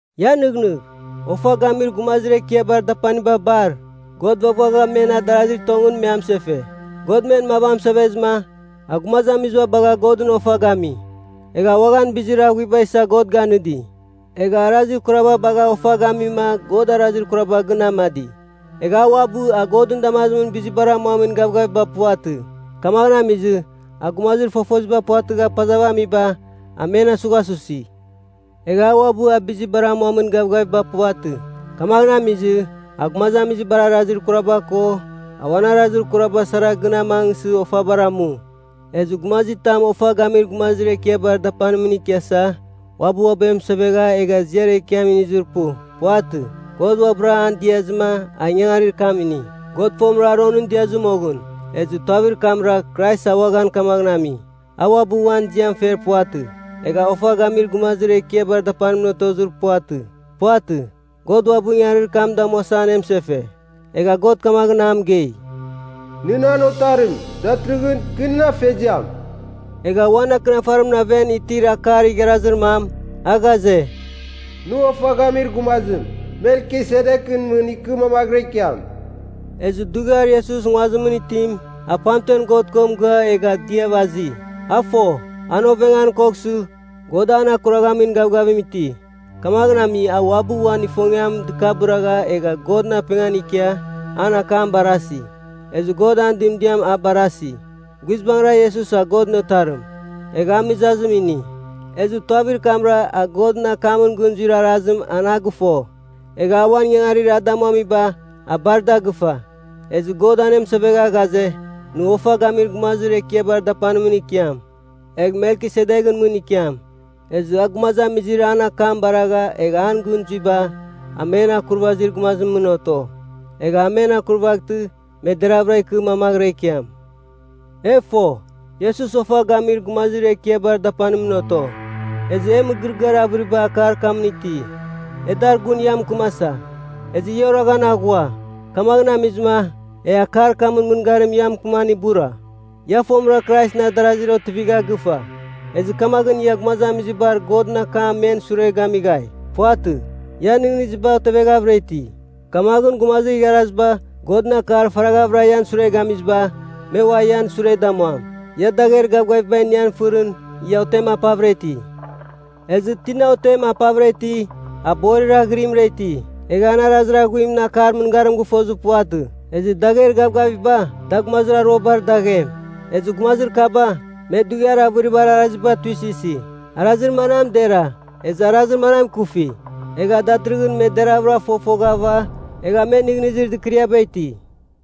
Ia nɨghnɨgh. Ofa Gamir Gumazir Ekiabar Dapaniba bar, God vaghvagha men adarazir tongɨn me amɨsefe. God men mav amɨsevezɨma, a gumazamiziba bagha Godɨn ofa gami. Egha uaghan bizir aghuiba isa God ganɨdi. Egha arazir kuraba bagha ofa gamima God arazir kuraba gɨn amadi. Egha a uabɨ a Godɨn damazimɨn bizibar amuamin gavgaviba puvatɨ. Kamaghɨn amizɨ, a gumazir fofoziba puvatɨgha pazav amiba, a men asughasusi. Egha a uabɨ a bizibar amuamin gavgaviba puvatɨ, kamaghɨn amizɨ a gumazamizibar arazir kuraba ko a uan arazir kuraba sara gɨn amangsɨ ofabar amu. Ezɨ gumazitam Ofa Gamir Gumazir Ekiabar Dapanimɨn ikiasa uabɨ uabɨ amɨsevegha egha ziar ekiam inizir pu. Puvatɨ. God uabɨra an diazɨma a ingangarir kam ini. God fomɨra Aronɨn diazɨ moghɨn. Ezɨ tuavir kamra, Krais a uaghan kamaghɨn ami. A uabɨ uan ziam fer puvatɨ, egha Ofa Gamir Gumazir Ekiabar Dapanmɨn otozir puvatɨ. Puvatɨ. God uabɨ ingangarir kam damuasa anemɨsefe. Egha God kamaghɨn a mɨgei, “Nɨ nan Otarim; datɨrɨghɨn, kɨ nɨn Afeziam.” Egha uan Akɨnafarimɨn aven itir akar igharazir mam, a ghaze, “Nɨ ofa gamir gumazim, Melkisedekɨn mɨn ikɨ mamaghɨra ikiam.” Ezɨ dughiar Iesus nguazimɨn itim, a pamtemɨn God ko mɨgɨa egha diav azi. A fo, an ovengan koghsɨ, God an akuraghamin gavgavim iti. Kamaghɨn ami a uabɨ uan ifongiam dɨkabɨragha egha Godɨn apengan ikia, an akam barasi. Ezɨ God an dɨmdiam a barasi. Guizbangɨra Iesus a Godɨn Otarim, egha a mɨzazim ini. Ezɨ tuavir kamra a Godɨn akamɨn gɨn zuir arazim an a gɨfo. Egha a uan ingangarir a damuamiba, a bar da gɨfa. Ezɨ God anemɨsevegha ghaze, “Nɨ Ofa Gamir Gumazir Ekiabar Dapanimɨn ikiam, egh Melkisedekɨn mɨn ikiam.” Ezɨ a gumazamizir an akam baragha egha an gɨn zuiba, a men akurvazir gumazimɨn oto. Egh a men akurvaghtɨ me deravɨra ikɨ mamaghɨra ikiam. E fo, Iesus Ofa Gamir Gumazir Ekiabar Dapanimɨn oto, ezɨ e mɨgɨrɨgɨar avɨriba akar kamɨn iti, e dar gun ia mɨkɨmasa. Ezɨ ia oraghan aghua. Kamaghɨn amizɨma, e akar kamɨn mɨngarim ia mɨkɨman ibura. Ia fomɨra Kraisɨn adarazir otivigha gɨfa, ezɨ kamaghɨn ia gumazamizibar Godɨn akam men sure gamighai. Puvatɨ, ian nɨghnɨziba oteveghavɨra iti, kamaghɨn gumazir igharaziba, Godɨn akar faraghavɨra ian sure gamiziba, me ua ian sure damuam. Ia dagher gavgaviba iniam fɨrɨn, ia otem apavɨra iti. Ezɨ tina otem apavɨra iti, a borir aghɨrimɨra iti. Egha an arazir aghuimɨn akar mɨngarim gɨfozir puvatɨ. Ezɨ dagher gavgaviba, da gumazir aruabar daghem. Ezɨ gumazir kaba, me dughiar avɨribar araziba tuisɨsi, arazir manam dera ezɨ arazir manam ikufi. Egha datɨrɨghɨn me deravɨra fofoghava egha me nɨghnɨzir dɨkɨriaba iti.